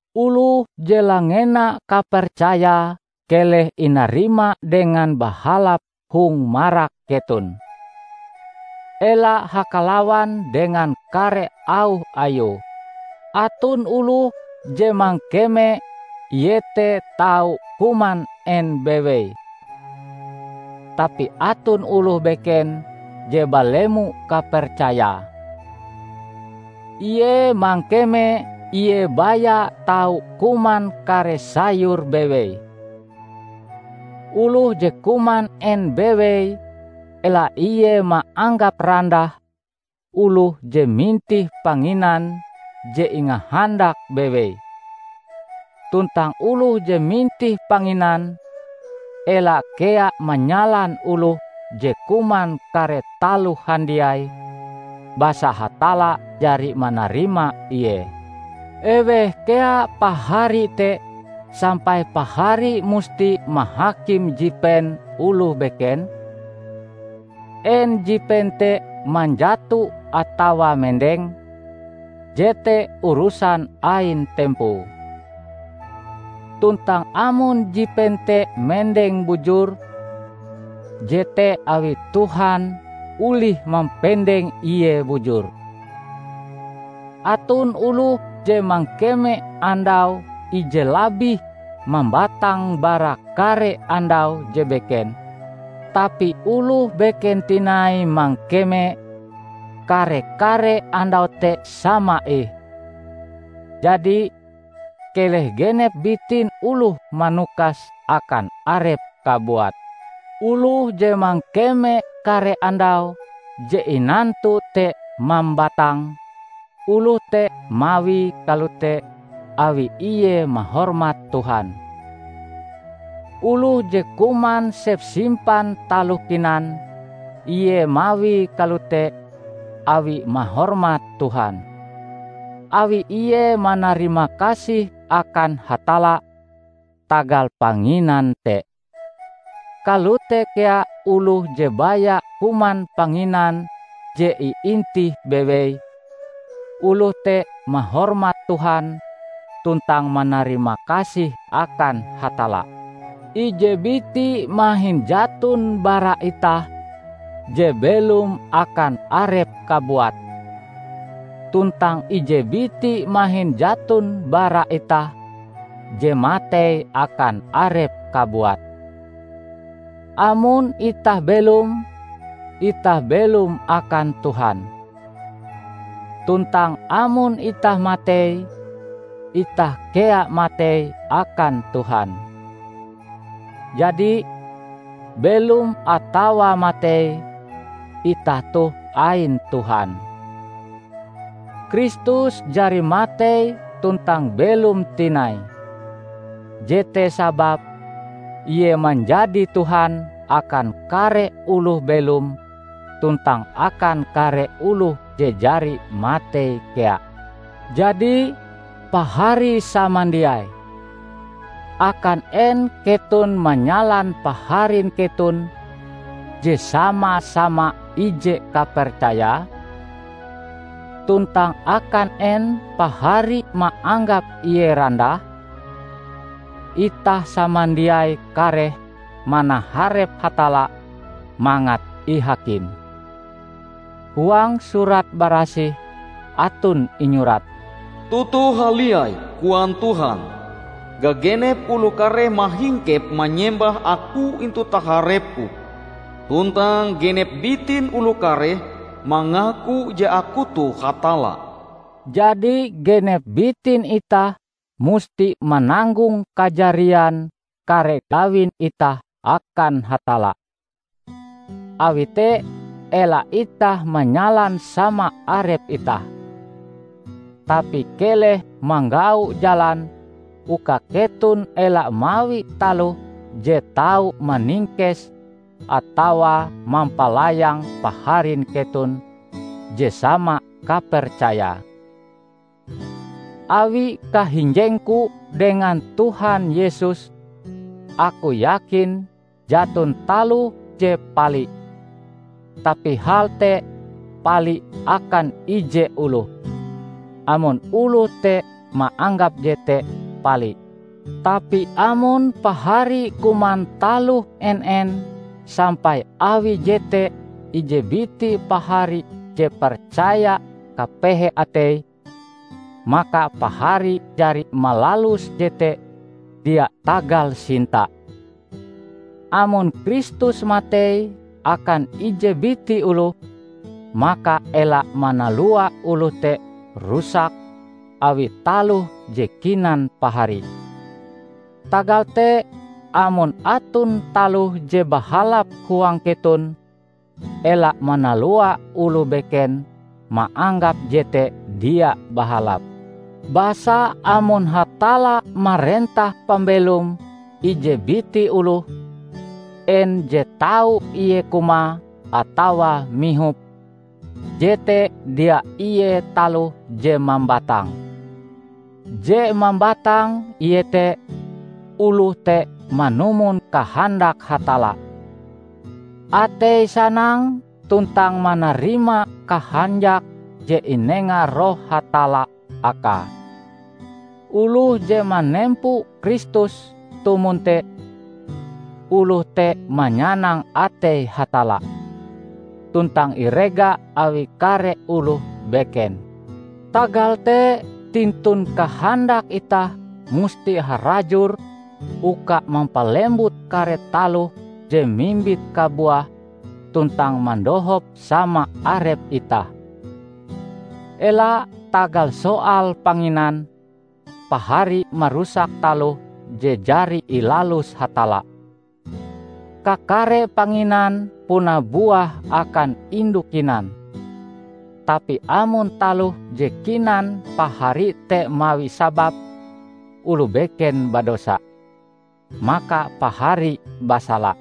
Oloh je langena kapercayae keleh inarima dengan bahalap hong marak keton. Ela hakalawan dengan kare auh ayue. Aton oloh je mangkeme ie te tau kuman en bewei. Tapi aton oloh beken je balemo kapercayae; ie mangkeme ie baya tau kuman kare sayur bewei. Oloh je kuman en bewei ela ie maanggap randah oloh je mintih panginan je ingahandake bewei; tuntang oloh je mintih panginan, ela kea manyalan oloh je kuman kare taloh handiai, basa Hatalla jari manarima ie. Eweh kea pahari te sampai pahari musti mahakim jipen oloh beken? En jipen te manjato atawa mendeng, jete urusan ain tempoe. Tuntang amon jipen te mendeng bujur, jete awi Tuhan olih mampendeng ie bujur. Aton oloh je mangkeme andau ije labih mambatang bara kare andau je beken, tapi oloh beken tinai mangkeme kare-kare andau te sama ih. Jadi, keleh genep bitin oloh manukas akan arepe kabuat. Oloh je mangkeme kare andau je inantu te mambatang, oloh te mawie kalote awi ie mahormat Tuhan. Oloh je kuman sepsimpan taloh kinan, ie mawie kalote awi mahormat Tuhan, awi ie manarimakasih akan Hatalla tagal panginan te. Kalote kea oloh je baya kuman panginan je iintih bewei; oloh te mahormat Tuhan tuntang manarimakasih akan Hatalla. Ije biti mahin jaton bara itah je belom akan arepe kabuat; tuntang ije biti mahin jaton bara itah je matei akan arepe kabuat. Amon itah belom, itah belom akan Tuhan. Tuntang amon itah matei, itah kea matei akan Tuhan. Jadi, belom atawa matei, itah toh ain Tuhan. Kristus jari matei tuntang belom tinai. Jete sababe Ie manjadi Tuhan akan kare oloh belom tuntang akan kare oloh je jari matei kea. Jadi, Pahari samandiai! Akan en keton manyalan paharin keton je sama-sama ije kapercaya? Tuntang akan en pahari maanggap ie randah? Itah samandiai kareh manaharep Hatalla mangat ihakim. Huang Surat Barasih aton inyurat, "Toto haliai," koan Tuhan, "gagenep oloh kareh mahingkep manyembah Aku intu taharep-Ku; tuntang genep bitin oloh kareh mangaku je Aku toh Hatalla." Jadi genep bitin itah musti mananggong kajarian kare gawin itah akan Hatalla. Awi te ela itah manyalan sama arep itah. Tapi keleh manggau jalan uka keton ela mawi taloh je tau maningkes atawa mampalayang paharin keton je sama kapercayae. Awi kahinjengku dengan Tuhan Yesus aku yakin jaton taloh je pali; tapi hal te pali akan ije oloh, amon oloh te maanggap jete pali. Tapi amon pahari kuman taloh en-en sampai awi jete ije biti pahari je percaya kapehe ateie, maka pahari jari malalus jete dia tagal sinta. Amon Kristus matei akan ije biti oloh, maka ela manalua oloh te rusak awi taloh je kinan pahari. Tagal te amon aton taloh je bahalap huang keton, ela manalua oloh beken maanggap jete dia bahalap. Basa amon Hatalla marentah pambelom ije biti oloh, en je tau ie kumae atawa mihope, jete dia ie taloh je mambatang. Je mambatang iete oloh te manumon kahandak Hatalla, ateie sanang tuntang manarima kahanjak je inenga Roh Hatalla akae. Oloh je manempo Kristus tumon te, oloh te manyanang atei Hatalla, tuntang irega awi kare oloh beken. Tagal te tintun kahandak itah musti harajur uka mampalembut kare taloh je mimbit kabuah tuntang mandohop sama arep itah. Ela, tagal soal panginan, pahari marusak taloh je jari ilalus Hatalla. Kakare panginan puna buah akan indu kinan; tapi amon taloh je kinan pahari te mawi sabab oloh beken badosa, maka pahari basala.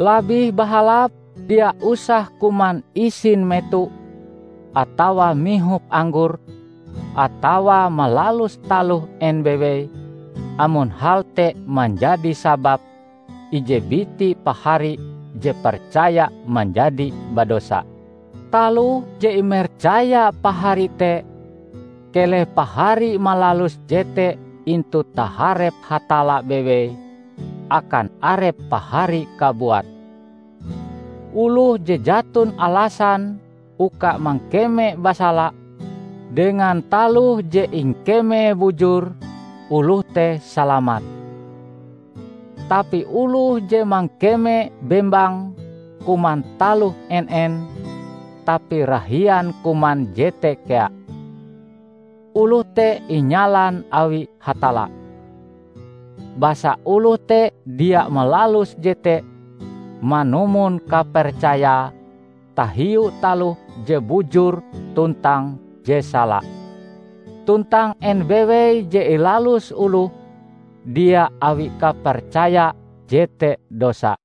Labih bahalap dia usah kuman isin meto atawa mihop anggor atawa malalus taloh en bewei amon hal te manjadi sabab ije biti pahari je percaya manjadi badosa. Taloh je imercaya pahari te, keleh pahari malalus jete intu taharep Hatalla bewei akan arep pahari kabuat. Oloh je jaton alasan uka mangkeme basala dengan taloh je ingkemee bujur, oloh te salamat. Tapi oloh je mangkeme bembang kuman taloh en-en, tapi rahian kuman jete kea, oloh te inyalan awi Hatalla; basa oloh te dia malalus jete manumon kapercayae tahiu taloh je bujur tuntang je sala. Tuntang en bewei je ilalus oloh dia awi kapercaya jete dosa.